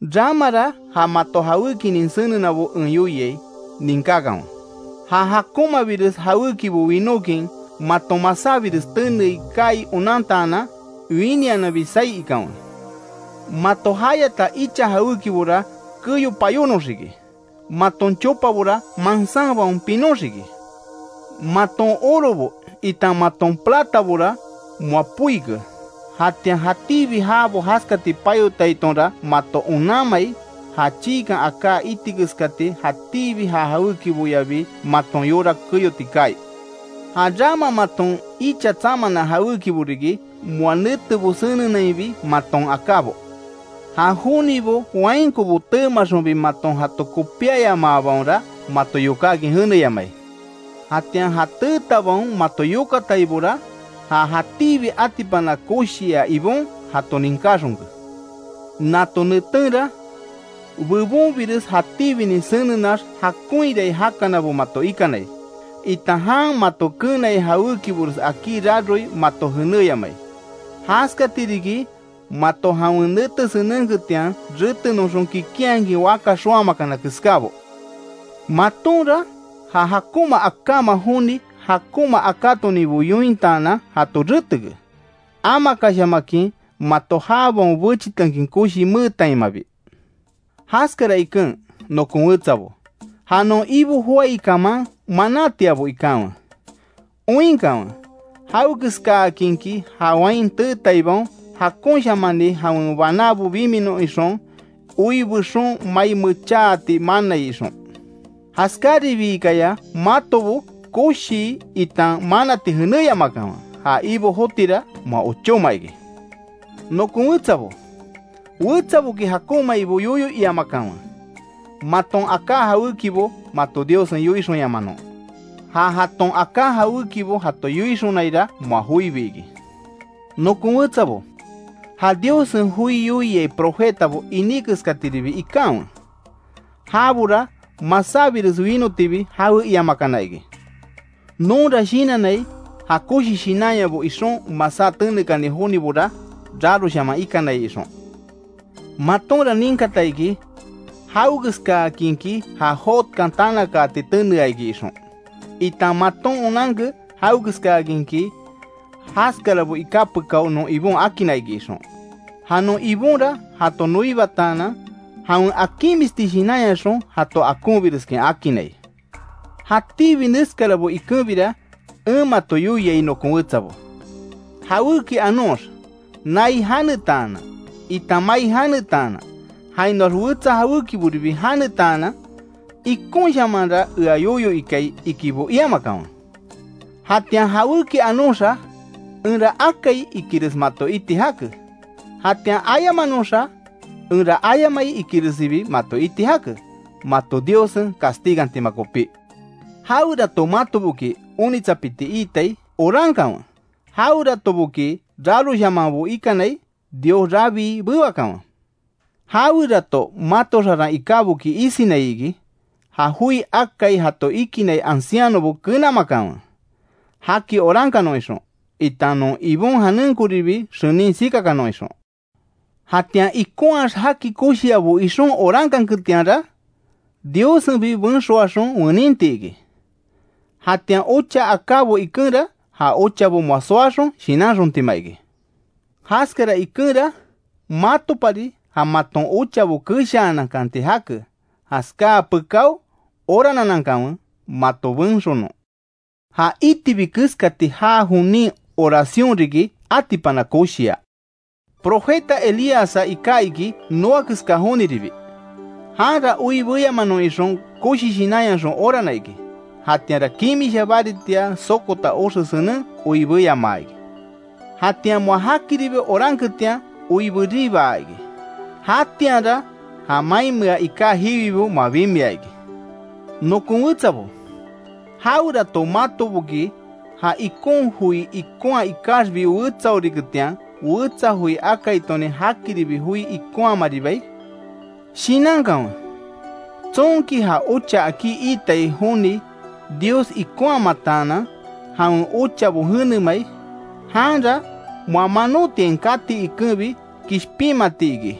Ramara ja mato jawékinin senenabo en yoiai, ninkákanwe: Ja jakonmabires jawékibo winókin maton masábires tenei kaai onantaanan, winiananbi saí ikanwe. Mato jayata icha jawékibora keyo payónoxiki, maton chopabora mansánbaon pinoxiki. Maton orobo itan maton platabora, moa poike, jatian jatíbi jabo jaskati payotaitonra mato onanmai, ja chiikan aká iti keskati jatíbi ja jawékiboyabi maton yora keyoti kaai. Ja rama maton icha tsamana jawékibo riki, moa netebo senenainbi maton akábo. Ja jonibo wainkobo teemaxonbi maton jato kopíayamaabaonra, mato yokákin jeneyamai. Jatian ja teetabaon mato yokataibora, ja jatíbi atipana koshia Ibon jato ninkáxonke. Nato netenra bebonbires jatíbinin senenax jakonhirai jakanabo mato ikanai, itan jan mato keenai jawékibores akí raroi mato jenéyamai. Jaskati riki mato jawen nete senenketian retenoxon kikinhakin waka xoámakana keskábo. Matonra ja jakonma akáma joni jakonma akátoninbo yointaanan jato reteke, amakashamakin mato jabaon bechitekin koshi meetaimabi. Jaskara iken nokon wetsabo, ja non Ibo joái kaman manátiabo ikanwe, oinkanwe jawekeskaakinki ja wain teetaibaon jakonshamani jawen banábo biminon ixon, oi bexon mai mechaati manai ixon. Jaskáribiikaya matobo koshii itan manati jenéyamakanwe, ja Ibo jotira moa ochóma iki. Nokon wetsabo, wetsaboki jakonmaibo yoyo iamakanwe; maton aká jawékibo mato Diossen yoinxonyamanon. Ja jaton aká jawékibo jato yoixonaira moa joibi iki. Nokon wetsabo, ja Diossen joi yoiai profetabo iní keskatiribi ikanwe, jabora masábires winotibi jawe iamakana iki. Nonra shinannai ja koshi shinanyabo ixon masá tenekani jonibora raroshaman ikanai ixon. Matonra ninkata iki jawekeskakinki ja Jobkan tanakaati tenea iki ixon, itan maton onanke jawekeskákinki jaskarabo iká pekáo non Ibon akinna iki ixon. Ja non Ibonra jato noibataanan, jawen akinmisti shinanyaxon jato akonbireskin akinnai. Jatíbi neskarabo ikenbira en mato yoiai nokon wetsabo, jawéki anox nai janetaanan, itan mai janetaanan jainoax wetsa jawékiboribi janetaanan, ikonshamanra ea yoyo ikai ikibo iamakanwe. Jatian jawéki anoxa enra akai ikires mato iti jake; jatian ayamanoxa enra ayamai ikiresibi mato iti jake, mato Diossen castigantima kopí. Jawerato matoboki onitsapiti itai orankanwe, jaweratoboki raroshamanbo ikanai Dios rabii bewakanwe, Jawerato mato xaran ikáboki isinai iki, ja joi akai jato ikinai ancianobo kenamakanwe, jaki orankanon ixon, itan non Ibon janenkonribi xenin sikakanon ixon. Jatian ikonhaax jaki koshiabo ixon orankanketianra, Diossenbi benxoaxon weninti iki. Jatian ocha akábo ikenra ja ochabo moa soaxon shinanxontima iki. Jaskara ikenra matopari ja maton ochabo keshaanankanti jake, jaskáa pekáo orananankanwe mato benxonon. Ja itibi keskati jaa jonin oración riki atipana koshia. Profeta Elíassa iká iki noa keska joniribi, janra oi beyamanon ixon koshi shinanyaxon orana iki, jatianra kimisha baritia sokota oxe senen oi beyamaa iki. Jatian moa jakiribi oranketian oi beribaa iki. Jatianra ja mainmea iká jiwibo moa bimia iki. Nokon wetsabo, jawerato matoboki ja ikon joi ikonha ikaxbi wetsaoriketian, wetsa joi akaitonin jakiribi joi ikonhamaribiai. Shinankanwe, tsonki ja ocha akí iitai joni Dios ikonhamataanan, jawen ochabo jenemai; janra moa manotiain kati ikenbi kishpinmati iki,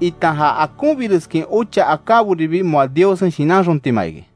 itan ja akonbireskin ocha akáboribi moa Diossen shinanxontima iki.